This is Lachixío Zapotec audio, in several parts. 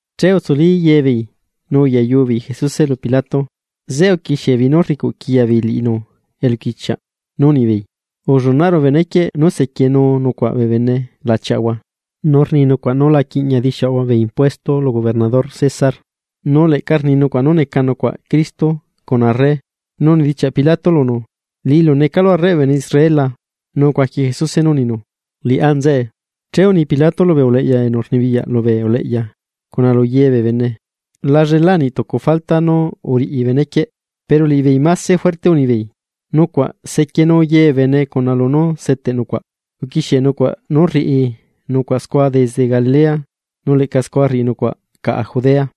Che utsuli ye beei, nu uyayu beei Jesuse lu Pilato. Zeꞌe uquixie beei nú rricuꞌ quiya beei liꞌinu eluquichiaꞌ, nu unibeei: ―Ullunaꞌru benequieꞌ nú sequienu nucuaꞌ bee bene lachiaꞌahua. Nu rni nucuaꞌ nú la quiꞌña dixiuꞌahua bee impuesto lu gobernador César, nu leꞌca rni nucuaꞌ nu neca nucuaꞌ Cristo cuna arre. Nu unidichiaꞌ Pilato lunu: ―¿Liꞌilu necalu arreꞌ bee bene Israel la? Nu ucuaqui Jesuse nú uninu: ―Liꞌá nzeꞌe. Che uni Pilato lubee uleꞌya enu rnibiyaꞌ lubee uleꞌya, cuna lu ye bee bene: ―La llelaa niꞌ tucu falta nú uriꞌi benequieꞌ. Pero liꞌibeei máse juerte unibeei: ―Nucuaꞌ sequienu ye bee bene cuna lunú seteꞌ nucuaꞌ. Uquixie nucuaꞌ nú rriꞌi nucuaꞌ scua desde Galilea, nu leꞌca scua rriꞌi nucuaꞌ caꞌa Judea.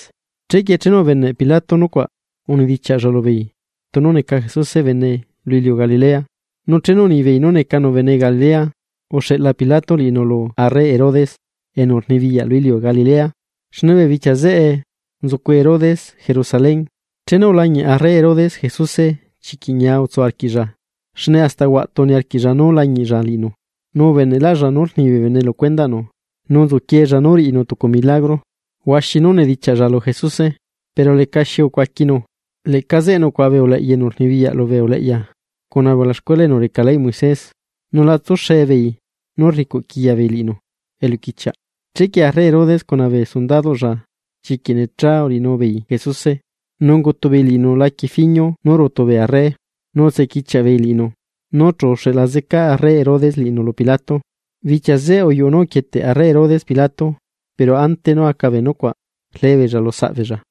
Chequie chenu ubeneꞌ Pilato nucuaꞌ, unidichiaꞌlla lubeei tunu neca Jesuse bene lu iliu Galilea. Nu chenu unibeei nú necanu bene Galilea, uxeꞌla Pilato liꞌinu lu arre Herodes enu rnibiyaꞌ lu iliu Galilea, xne bee bichia zeꞌe nzucu Herodes Jerusalén. Chenu ulañiꞌ arre Herodes Jesuse chiquiꞌ ñia utsu arquiꞌlla, xne hasta huaꞌtu niarquiꞌlla nú lañiꞌlla liꞌinu. Nu ubeneꞌlaꞌlla nú rni bee bene lu cuendaꞌnu, nu nzuquiella nú riꞌinu tucu milagro. Huaxi nú unidichiaꞌlla lu Jesuse, pero lecaxi ucuaquinu. Leꞌca zeꞌe nucuaꞌa bee uleꞌya enu rnibiyaꞌ lubee uleꞌya, cuna bee ulaxcuela enu reca leyꞌ Moisés, nu la tsuxe beei nú rricuꞌquiya beei liꞌinu eluquichiaꞌ. Chequie arre Herodes cuna bee sundadoꞌlla chiquiꞌ necha uriꞌinu beei Jesuse, nu ungutu beei liꞌinu laquie fiñu nú rutu bee arre, nu xitse uriꞌchia beei liꞌinu, nu chu uxeꞌla zeca arre Herodes liꞌinu lu Pilato. Bichia zeꞌe uyuꞌu nú uquieteꞌ arre Herodes Pilato, pero ante nú aca bee nucuaꞌ, rlee beella lu saꞌ beella.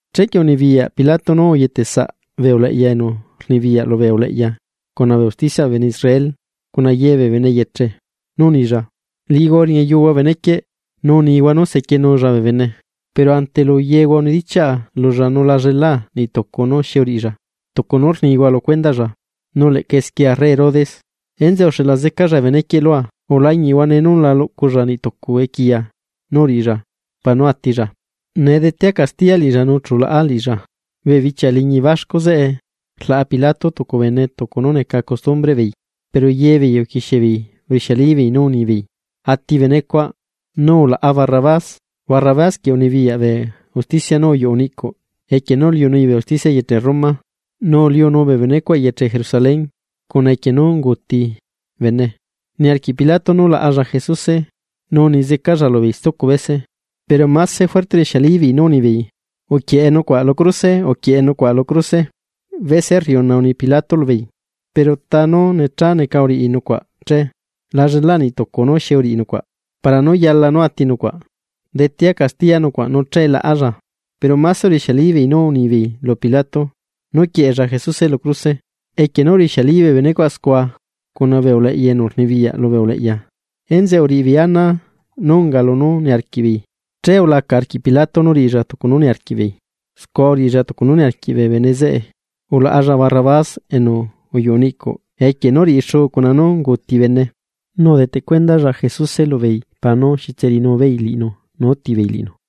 Chequie unibiyaꞌ Pilato nú uyete saꞌ bee uleꞌya enu rnibiyaꞌ lubee uleꞌya cuna bee usticiaꞌ bee bene Israel, cuna ye bee bene yeche. Nu unilla. ―Liꞌihua uriñayuhua benequieꞌ, nu unihua nú sequienulla bee bene. Pero ante lu yehua unidichiaꞌa lulla nu la llelaa niꞌ tucu nú xi uriꞌilla, tucu nú rnihua lu cuendaꞌlla. Nu leꞌca esquie arre Herodes. Enzeꞌe uxeꞌla zecalla benequieꞌ lua. Ulañiꞌhua nee nú la luꞌculla niꞌtucu equiya nú uriꞌilla para nú atilla. Nee detea castiya liꞌilla, nu chu laꞌa liꞌilla. Bee bichia liñi baxcu zeꞌe rlaꞌa Pilato tucu bene tucu nú neca costumbreꞌ beei. Pero ye beei uquixie beei urixialibeei nú unibeei: ―¡Ati benecuaꞌ! ¡Nu ulaꞌa Barrabás! Barrabás quieꞌ unibiyaꞌ bee usticia nú uyuꞌi niꞌcuꞌ equie nú uliunui bee usticia eyeche Roma nu uliunuu bee benecuaꞌ eyeche Jerusalén, cuna equie nú unguuti bene. Niarquiꞌ Pilato nú laꞌalla Jesuse, nu uni zecalla lubeei stucu bese, pero máse juerte urixialibeei nú unibeei: ―¡Uquieꞌe nucuaꞌ lu cruse! ¡Uquieꞌe nucuaꞌ lu cruse! Bese rriuna uni Pilato lubeei: ―Pero ¿ta nú necha neca uriꞌi nucuaꞌ che? La llela niꞌ tucu nú xi uriꞌi nucuaꞌ para nú yala nú ati nucuaꞌ, detea castiya nucuaꞌ nu che laꞌalla. Pero máse urixialibeei nú unibeei lu Pilato nú quieꞌella Jesuse lu cruse. Equie nú urixiali bee benecuaꞌ scua cuna bee uleꞌya enu rnibiyaꞌ lubee uleꞌya, enzeꞌe uriꞌi beei ana nú unga lunú niarquiꞌ beei. Che ulaca arquiꞌ Pilato nú riꞌilla tucu nú niarquiꞌ beei. Scua uriꞌilla tucu nú niarquiꞌ bee bene zeꞌe, ulaꞌalla Barrabás enu uyuꞌu niꞌcuꞌ equie nú uriꞌi xuu cuna nú unguuti bene, nu udeteꞌ cuendalla Jesuse lubeei para nú riꞌi beei lunú niarquiꞌ beei cuna liꞌinu.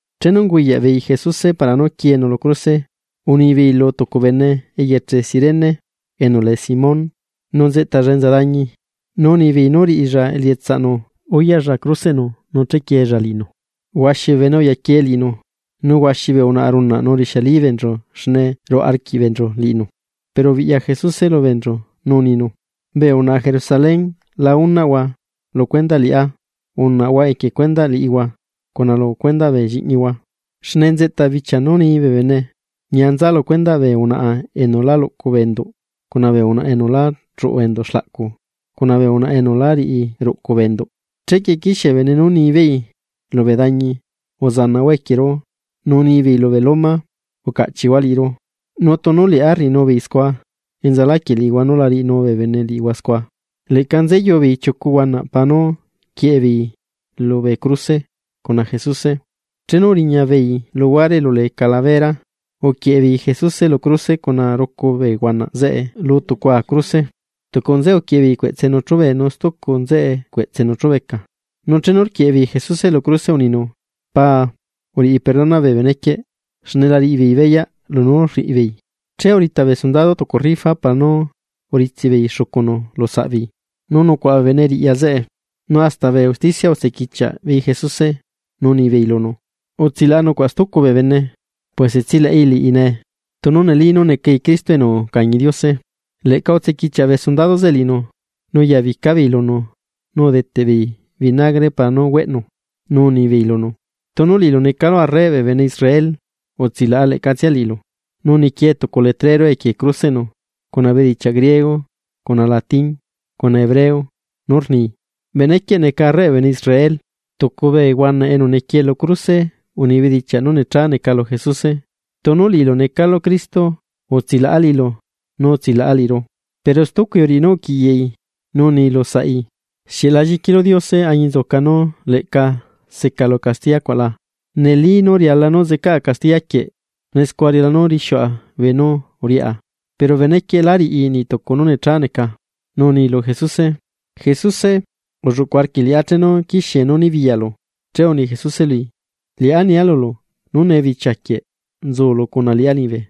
Chenu unguyaꞌ beei Jesuse para nú quienu lu cruse, unibeei lu tucu bene eyeche Cirene, enu lee Simón. Nu nzeꞌtalla enza dañi, nu unibeei nú riꞌilla elietsaꞌnu uyaꞌlla cruseꞌnu nu chequiella liꞌinu. Huaxi bee bene uyaquie liꞌinu, nu huaxi bee unaꞌa runaꞌ nu rixiali beenchu xne ruꞌa arquiꞌ beenchu liꞌinu. Pero ubiꞌya Jesuse lu beenchu nu uninu: ―Bee unaꞌa Jerusalén, la unaꞌhua lu cuendaꞌ liꞌá, unaꞌhua equie cuendaꞌ liꞌihua cuna lu cuendaꞌ bee lliꞌñihua. Xne nzeꞌta bichia nú ni bee bene: “Ñia nza lu cuendaꞌ bee unaꞌa enu lá luꞌcu bee enduꞌ, cuna bee unaꞌa enu la chuꞌu enduꞌ xlaꞌcu, cuna bee unaꞌa enu lá riꞌi ruꞌcu bee enduꞌ.” Chequie quixie bee bene nú ni beei lubee dañi: “¡Uzanaꞌhua equieru!”, nu ni beei lubee loma: “¡Ucaꞌchiꞌhua liꞌiru!” Nu tunu liꞌá rriꞌinu beei scua, ¿enza laquieꞌ liꞌihua nú la riꞌinu bee bene liꞌihua scua? Leꞌca nzeyu beei chiucu huanaꞌ para nú quieꞌe beei bee nzeꞌe lubee cruse, cuna Jesuse. Chenu uriña beei luhuare elu lee calabera, uquieꞌe beei Jesuse lu cruse cuna rucu bee huanaꞌ zeꞌe lu tucua cruse. Tucu nzeꞌe uquieꞌe beei cueꞌtsenu chúbee, nu stucu nzeꞌe cueꞌtsenu chúbeca. Nu chenu rquieꞌe beei Jesuse lu cruse uninu: ―Paa, uriꞌi perdona bee benequieꞌ xne la riꞌi beei beyaꞌ lunú rriꞌi beei. Che urita bee sundado tucu rifa para nú uritsiꞌ beei xucunu lu saꞌ beei. Nu nucuaꞌa bee bene riꞌya zeꞌe, nu hasta bee usticia utsequichiaꞌ beei Jesuse, nu unibeei lunu: ―Utsilaꞌa nucuaꞌ stucu bee bene, puese tsilaꞌi liꞌi nee, tunu neli nú necai Cristo enu ucañi Diose. Leꞌca xitse uriꞌinuu bee sundado zeꞌe liꞌinu, nu uyabica beei lunu nu udeteꞌ beei vinagre para nú güeꞌnu. Nu unibeei lunu: ―¡Tunu liꞌilu necalu arreꞌ bee bene Israel, utsilaꞌa leꞌcatsia liꞌilu! Nu niquie tucu letrero equie cruseꞌnu, cuna bedichiaꞌ griego cuna latín, cuna hebreo, nú rni: “Benequieꞌ neca arreꞌ bee bene Israel.” Tucu bee huanaꞌ enu niquie lú cruse uni bedichiaꞌ nú necha neca lu Jesuse: ―¡Tunu liꞌilu necalu Cristo, utsilaꞌa liꞌilu nu utsilaꞌa liꞌiru! Pero stucui uriꞌi nú uquiꞌyaꞌi nu uni lusaꞌi: ―¿Xieꞌ la lliquilu Diose añinzuca nú leꞌca secalu castiya cuaꞌla? Neli nú riala zeꞌcaꞌa castiya quieꞌ, xne scua riala nú rixiuꞌa beenú uriꞌá, pero benequieꞌ lá riꞌi niꞌ tucu nú necha neca. Nu uni lu Jesuse: ―Jesuse, ulluꞌcuꞌ arquiꞌ liꞌá chenu quixie nú nibiyaꞌlu. Che uni Jesuse lui: ―Liꞌá nia lulu, nú nee bichiaquieꞌ nzulu cuna liꞌá liñibe.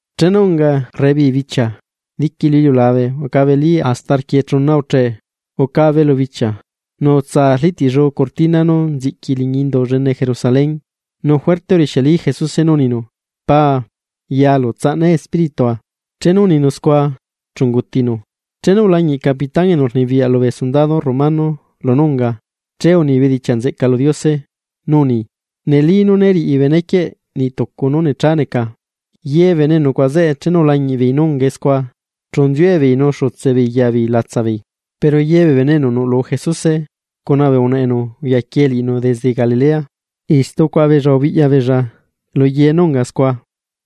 Chenu unga rebibichia, diqui lu iliulabe ucabelí hasta rquiechuna uchee. Ucabe lu bichia, nu utsaa arliꞌtiꞌlluu cortina nú nziꞌqui liñi Indu llene Jerusalén. Nu juerte urixiali Jesuse nú uninu: ―¡Paa, yalu tsaꞌna espíritua! Chenu uninu scua, chu ungutinu. Chenu ulañiꞌ capitañi enu rnibiyaꞌ lubee sundado romano lunú unga, che uni bedichiaꞌ nzeꞌca lu Diose nú uni: ―Neli nú né riꞌi benequieꞌ niꞌ tucu nú necha neca. Ye bee bene enu nucuaꞌa zeꞌe, chenu ulañiꞌ beei nú ungae scua, chu nziue beei nu xutse beei ya beei latsa beei. Pero ye bee bene enu nuꞌlu Jesuse, cuna bee unaꞌa enu uyaquiee liꞌinu desde Galilea, istu ucuaꞌa beella ubiꞌya beella lu ye nú unga scua.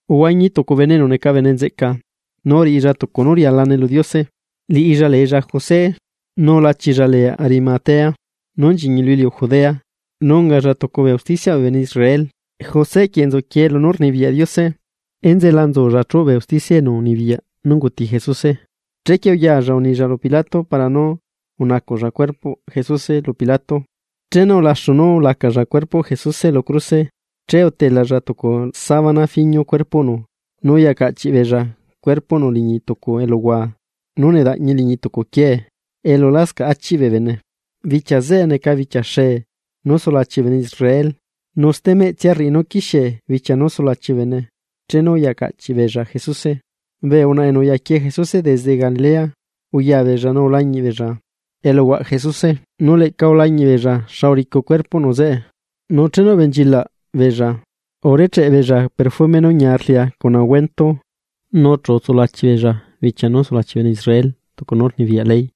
Uhuañi tucu bene enu neca bene nzeꞌca, nu uriꞌilla tucu nú rialane lu Diose. Liꞌilla leella José. Nu lachilla lee Arimatea, nú nchiñi lu iliu Judea, nu ungalla tucu bee usticiaꞌ bee bene Israel. José quieꞌ nzuquiee lunú rnibiyaꞌ Diose. Enzeꞌe la nzulla chúꞌ bee usticia enu unibiyaꞌ nú unguti Jesuse. Chequie uyaalla unilla lu Pilato para nú unacuꞌlla cuerpoꞌ Jesuse lu Pilato. Chenu ulaxu nú ulacalla cuerpoꞌ Jesuse lu cruse, che utelalla tucu sabana fiñu cuerpoꞌnu, nu uyacaꞌchiꞌ beella cuerpoꞌnu liñi tucu eluhua nú nedaꞌñi liñi tucu quiee, elu lascaꞌ achiꞌ bee bene. Bichia zeꞌe neca bichia xee nú sulachi bee bene Israel, nu stemeꞌtsia rriꞌi nú quixiee bichia nú sulachi bee bene chenu uyacaꞌchiꞌ beella Jesuse. Bee unaꞌa enu uyaquiee Jesuse desde Galilea, uya beella nu ulañiꞌ beella eluhuaꞌ Jesuse, nu leꞌca ulañiꞌ beella xa uricu cuerpoꞌnu zeꞌe. Nu chenu ubenchilaꞌ beella, urecheꞌ beella perfume nú ñia rlia cuna ungüento. Nu chu utsulachi beella bichia nú sulachi bee bene Israel, tucu nú rnibiyaꞌ ley.